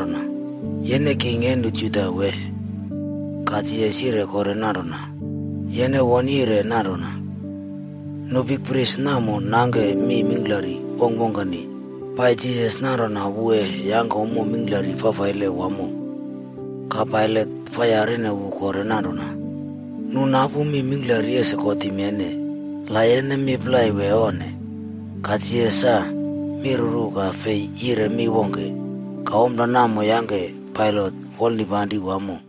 Ka Pailat yarine Jisas nanrona, “Yene king e nu Juda wee?” Ka Jisas yire kore nanrona, “Yene wone yire nanrona.” Nu bikpris namo nangke mi mingklari wongkwongkeni pai Jisas nanrona wu e yangke ommo mingklari fafaile wamo. Ka Pailat fa yarine wu kore nanrona, “Nu napu mi mingklari ese kotim yene, la yene mi plai wee onne?” Ka Jisas sa miruru ka fei yire mi wongke. Ka ompla namo yangke Pailat wolnipanri wamo.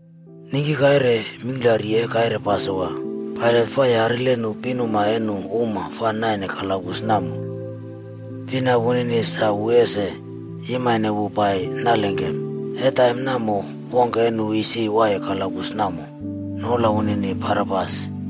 Ningki kaire mingklari e kaire Pasowa, Pailat fa yarile nu pinuma e nu uma fa naine kalabus namo fina nunini sa wu ese yimane wu pai nalengkem. E taim namo, wongke e nu isi waiye kalabus namo, noula wunini Barabas.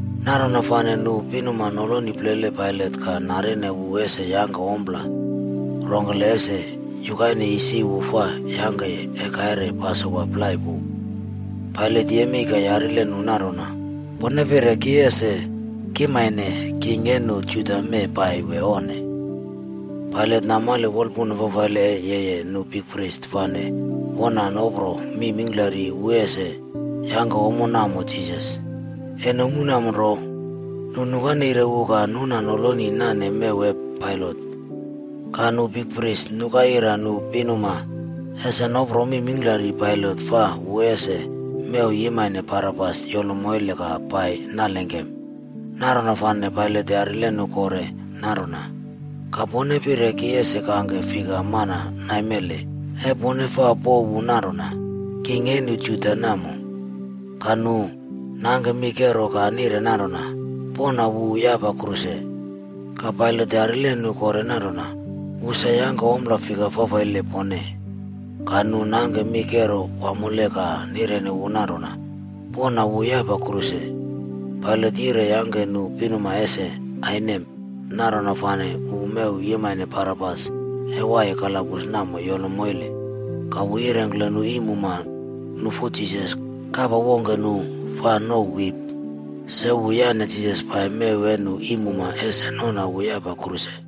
Nanrona fane nu pinuma noloni plele Pailat ka narine wu ese yangke ompla rongkele ese yukaine isi wu fa yangkeye e kaire Pasowa plai pu. Pailat yemei ka yarile nu nanrona, “Pone pire ki ese kimane king e nu Juda mee pai wee onne?” Pailat namale wolpuna fafaile e yeye nu bikpris fane wona nopro mi mingklari wu ese yangke ompla namo Jisas. E nomu namo nro, nu nukaire wu ka nuna noloni nane mew e Pailat. Ka nu bikpris nuka ira nu pinuma ese nopro mi mingklari Pailat fa wu ese mew yimane Barabas yolo moile ka pai nalengkem. Nanrona fane Pailat yarile nu kore nanrona, “Ka pone pire ki ese kangke fika mana naimele e pone fa pouw wu nanrona, ‘king e nu Juda’ namo?” Ka nu nangke mi kero ka nire nanrona, “Pona wu yapa kruse.” Ka Pailat yarile nu kore nanrona, “Wu sa yangke ompla fika fafaile pone?” Ka nu nangke mi kero wamole ka nireni wu nanrona, “Pona wu yapa kruse.” Pailat yire yangke nu pinuma ese ainem, nanrona fane wu mew yimane Barabas e waiye kalabus namo yolo moile. Ka wu yirengkle nu iimuma nufu Jisas kapa wongke nu fa nouw wip.a Se wu yane Jisas pai mew e nu iimuma ese nona wu yapa kruse.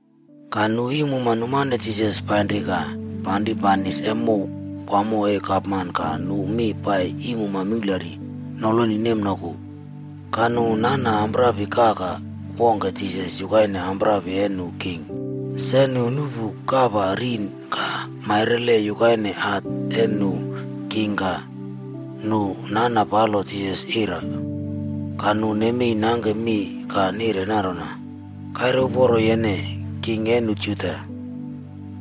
Ka nu iimuma numane Jisas painri ka panri banis e mow wamo e gapman ka nu mi pai iimuma mingklari noloni nemnoku. Ka nu nana amprapi kaka wongke Jisas yukaine amprapi e nu king. Se nu nuꞌpu kapa rin ka mairemaire yukaine hat e nu king ka nu nana palo Jisas ira. Ka nu nemei nangke mi ka nire nanrona, “Kaire uporo yene, king e nu Juda!”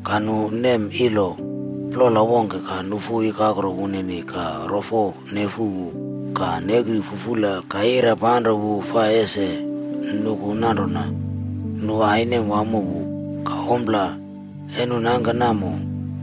Ka nu nem ilo plola wongke ka nufu ikakro wunini ka rofo nefu wu ka nekri fufula ka ira panro wu fa ese nuku nanrona nu ainem wamo wu. Ka ompla e nu nangke namo,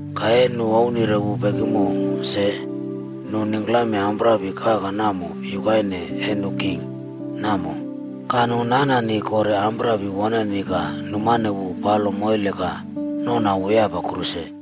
Ka e nu ouwnire wu pekimo se, nu ningklame amprapi kaka namo yukaine e nu king namo. Ka nu nanani kore amprapi woneni ka numane wu palo moile ka nona wu yapa kruse.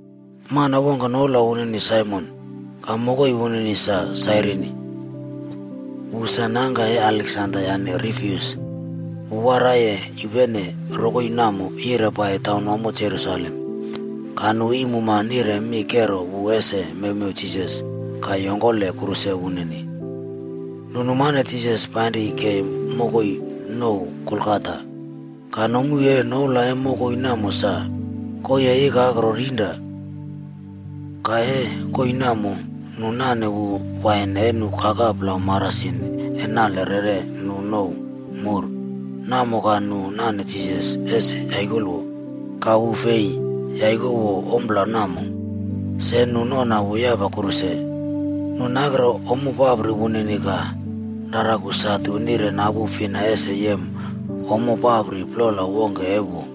Mana wongke noula wunini Saimon ka mokoi wunini sa Sairini. Wu sa nangka e Aleksanda yane Rufus. Wu waraiye yupene rokoi namo yire pai taunwamo Jerusalem. Ka nu iimuma nire mi kero wu ese mewmew Jisas ka yongkole kruse wunini. Nu numane Jisas painri kei mokoi nouw Golgata. Ka nomu e noula e mokoi namo sa: “Koii e ikakro rinra.” Ka e koii namo, nu nane wu wain e nu kaka plau marasin e nale rere nu nouw “mur” namo ka nu nane Jisas ese yaikowo. Ka wu fei yaikowo ompla namo. Se nu nona wu yapa kruse. Nu nakrere ommo papri wunini ka raraku satu nire napu fina ese yem ommo papri plola wongke e wu.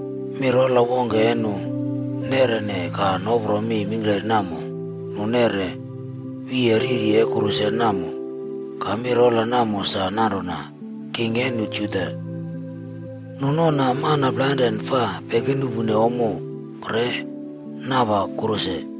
Mi rola wongke e nu nerine ka nopro mi mingklari namo, nu neꞌre wiye riri e kruse namo. Ka mi rola namo sa nanrona: “KING E NU JUDA.” Nu nona mana plainrane fa pekinuꞌpu ommo re napa kruse.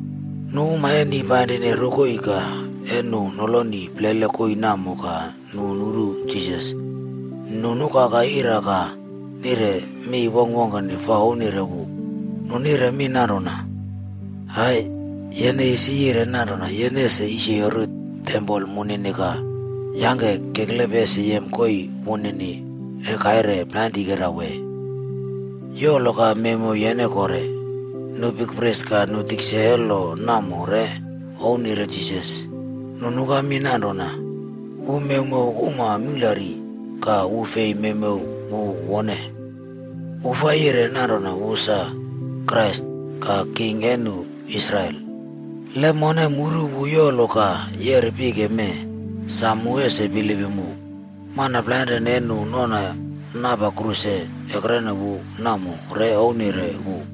Nu uma e ni painrine rokoi ka e nu noloni plele koii namo ka nu nuru Jisas, nu nukaka ira ka nire mi wongkwongkeni fa ouwnire wu. Nu nire mi nanrona, “Aaa, yene isi yire nanrona yene ese yisyori tempol munini ka yangke keklepe ese yem koii wunini e kaire plainrikera wee! Yolo ka mewmew yene kore.” Nu bikpris ka nu tikse e lo namo re ouwnire Jisas. Nu nuka mi nanrona, “Wu mewmew uma mingklari, ka wu fei mewmew wu wone! Wu fa yire nanrona wu sa Krais ka king e nu Israel. Le, mone muru wu yolo ka yeri pike mee, sa mu ese bilipim wu.” Mana plainrane e nu nona napa kruse ekrene wu namo re ouwnire wu.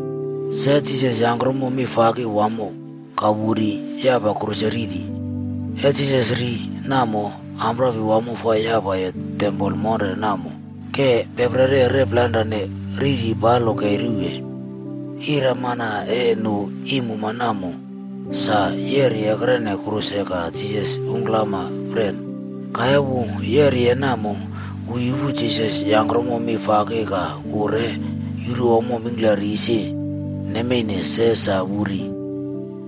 Se Jisas yangkromo mi faki wamo ka wu ri yapa kruse riri. E Jisas ri namo, amprapi wamo fa yapaye tempol monre namo ke peperi rep plainre, riri yolpalo kei ruwe. Iramana e nu iimuma namo sa yeri ekrene kruse ka Jisas ungklampren. Ka e wu yeriye namo, wu yupu Jisas yangkromo mi faki ka wu re yuru ommo mingklari isi nemeine se sa wu ri.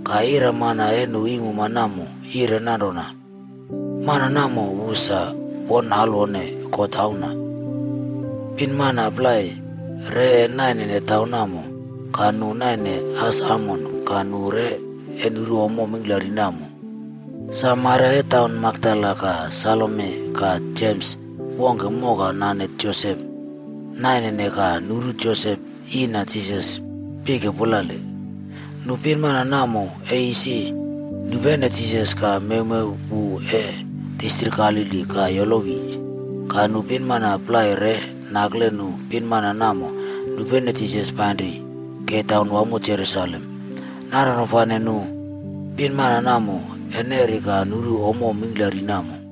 Ka iramana e nu iimuma namo yire nanrona, “Mana namo wu sa won alwone God Auna.” Pinmana plai re e naine taim namo. Ka nu naine as amone ka nu re e nuru ommo mingklari namo. Sa Maria e taun Makdala ka Salome ka Jems wongke moka nane Josep naine ka nuru Josep yiina Jisas pike pulale. Nu pinmana namo e isi nupene Jisas ka mewmew wu e distrik Galili ka yolowi. Ka nu pinmana plai re nakle nu pinmana namo nupene Jisas painri kei taunwamo Jerusalem. Nanrona fane nu pinmana namo e neri ka nuru ommo mingklari namo.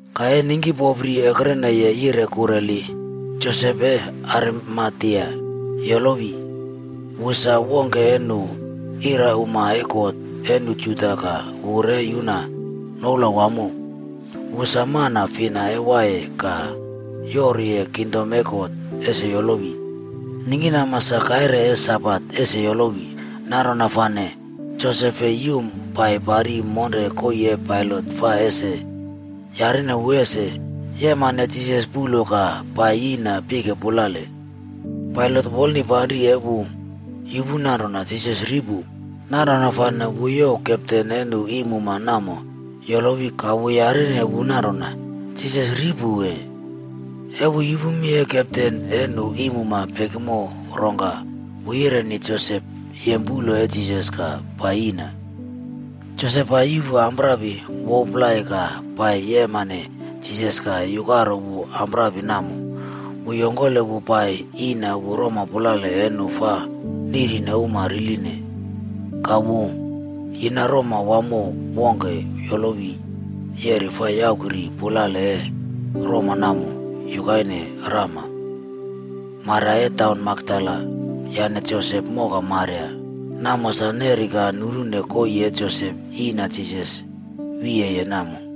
Ka e ningkipopri ekreneye yire kurela, Josep e Arimatea yolowi. Wu sa wongke e nu irauma e kot e nu Juda ka wu re yuna noula wamo. Wu sa mana fina e waiye ka yoruye kingdom e God ese yolowi. Ningkinama sa kaire e Sabat ese yolowi. Nanrona fane Josep fei yum pai pari monre koii e Pailat fa ese yarine wu ese yimane Jisas puꞌlo ka pai yiꞌna pike pulale. Pailat wolnipanri e wu yupu nanrona Jisas ri pu. Nanrona fane wu youw kepten e nu iimuma namo yolowi ka wu yarine wu nanrona, “Jisas ri pu wee?” E wu yupu mi e kepten e nu iimuma pekimo rongka wu yireni Josep yem puꞌlo e Jisas ka pai yiꞌna. Josep pai yuꞌpu amprapi wouw plai ka pai yemane Jisas ka yukaro wu amprapi namo. Wu yongkole wu pai yina wu roma pulale e nu fa niꞌrine uma riline. Ka wu yine roma wamo wongke yolowi yeri fa yakrau pulale e roma namo yukaine rama. Maria e taun Makdala yane Josep moka Maria namo sa neri ka nurune koii e Josep yina Jisas wiyeye namo.